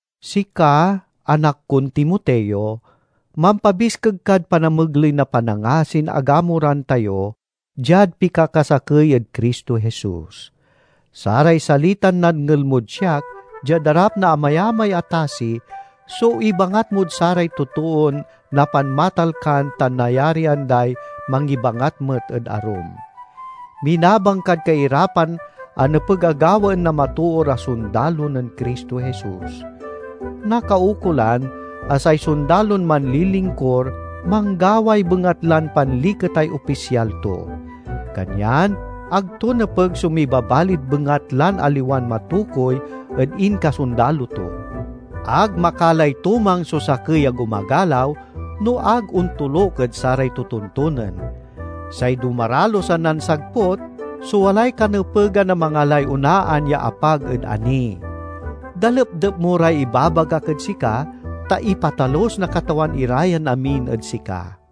Sika, anak kon Timoteo, mampabiskeg kad panamegley na panangasin agamuran tayo diad pikakasakey ed Cristo Jesus. Saray salitan nadngel mod siak diad arap na amayamay a tasi so ibangat mod saray totoon napanmatalkan tan nayarian day mangibangat met ed arum. Minabang kad kairapan a nepeg a gawaen na matoor a sondalo nen Cristo Jesus. Nakaukolan a say sondalon manlilingkur manggaway bengatlan panliketay opisyal to. Kanyan ag to nepeg so mibabalid bengatlan aliwan matokuy ed inkasondalo to. Ag makalay tumang so sakey a gumagalaw no ag ontoluk ed saray totontonen. Say dumaralus a nansagput so walay kanepegan a mangalay onaan ya apag ed ani. Dalepdep mo ray ibabagak ed sika, ta ipatalus na Katawan ira yan amin ed sika.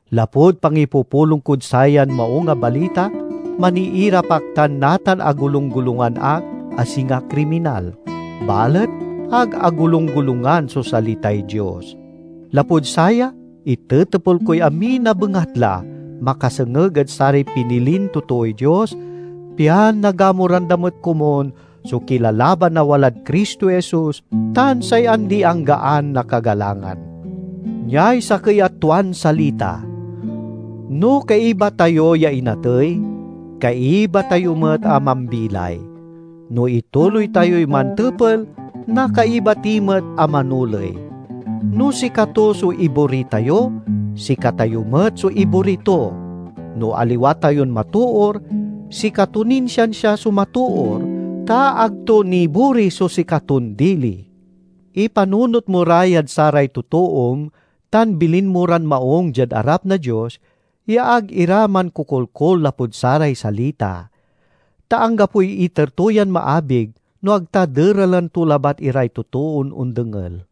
Lapud pangipupulong kod sayan Maung a Balita, maniirap ak tan natan agolunggolungan ak a singa kriminal. Balet ag agolunggolungan so salitay Dios. Lapud saya itetepel koy amin a bengatla, makasengeg ed saray pinilin totooy Dios, pian nagamuran da met komun so kilalaban a walad Cristo Jesus tan say andi-anggaan a kagalangan. Niay sakey a tuan salita: "No kaiba tayo ya inatey, kaiba tayo met a mambilay. No ituloy tayoy mantepel, nakaiba ti met a manoley. No sikato so ibori tayo, sikatayo met so ibori to. No aliwa tayon matoor, sikato nin siansia so matoor, ta ag to nibori so sikaton dili." Ipanunot mo ra yad saray totoom tan bilin mo ran maung diad arap na Dios, ya ag ira mankokolkol lapud saray salita. Ta anggapoy iter to yan maabig, no ag ta deralen to labat iray totoon ondengel.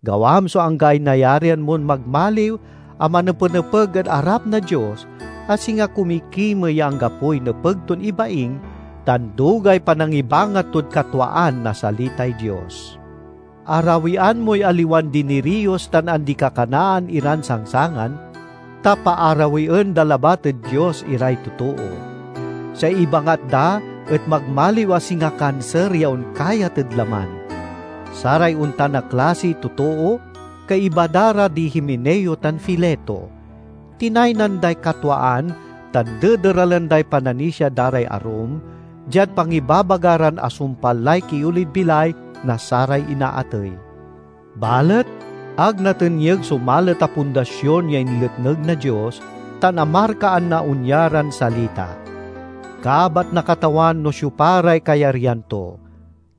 Gawam so anggaay nayarian mon magmaliw a manepenepeg ed arap na Dios, a singa kumikimey ya anggapoy nepeg ton ibaing, tan dugay panangibangat tod katwaan na salitay Dios. Arawian moy aliwan diniriyos tan andi-kakanaan iran sangsangan, ta paarawien da labat ed Dios iray totoo. Say ibangat da et magmaliw a singa kanser ya onkayat ed laman. Saray ontan a klasiy totoo kaiba da ra di Himeneo tan Fileto. Tinaynan day katwaan tan dederalen day pananisia da ray arum, diad pangibabaga ran asumpal lay kiolid bilay na saray inaatey. Balet ag natenyeg so malet a pundasion ya inletneg na Dios; tan amarkaan na onya ran salita: "Kabat na Katawan no siopa ray kayaryan to";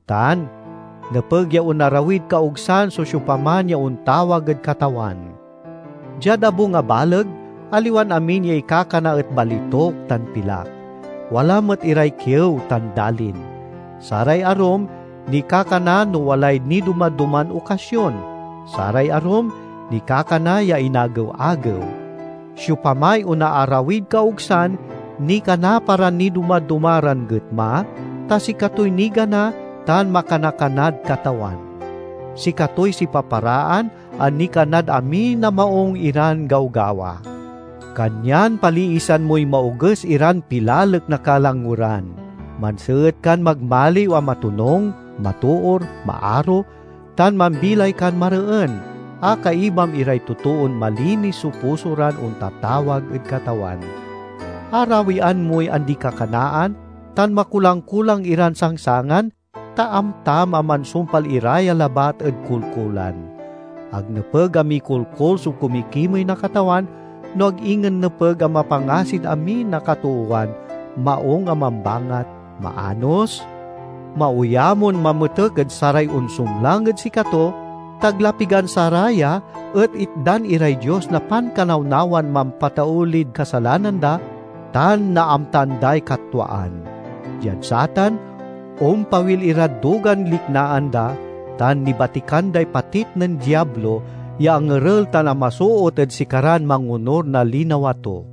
tan, "Nepeg ya onarawid kaogsan so siopaman ya ontawag ed Katawan." Diad abung a baleg, aliwan amin ya ikakana et balituk tan pilak. Wala met iray kiew tan dalin. Saray arum nikakana no walay nidoma-doman okasion; saray arum nikakana ya inagew-agew. Siopamay onaarawid kaogsan nikana para nidoma-doma ran getma, ta sikatoy nigana tan makana-kanad Katawan. Sikatoy sipaparaan a nikanad amin a maung iran gawgawa. Kanyan paliisan moy maoges iran pilalek na kalangweran. Manseet kan magmaliw a matonung, matoor, maaro, tan mambilay kan mareen, a kaibam iray totoon malinis so puso ran ontatawag ed Katawan. Arawian moy andi-kakanaan tan makulang-kulang iran sangsangan, ta amtam a mansumpal ira ya labat ed kolkolan. Ag nepeg a mikolkol so kumikimey na Katawan, no ag ingen nepeg a mapangasid amin a katoowan, maung a mambangat, maanos, maoyamon mametek ed saray onsumlang ed sikato, ta ag la pigan saraya et itdan iray Dios na pankanawnawan mampataulid kasalanan da tan naamtaan day katwaan. Diad satan, ompawil irad dugan liknaan da tan nibatikan day patit nen Diablo ya angerel tan amasoot ed sikaran mangonur na linawa to.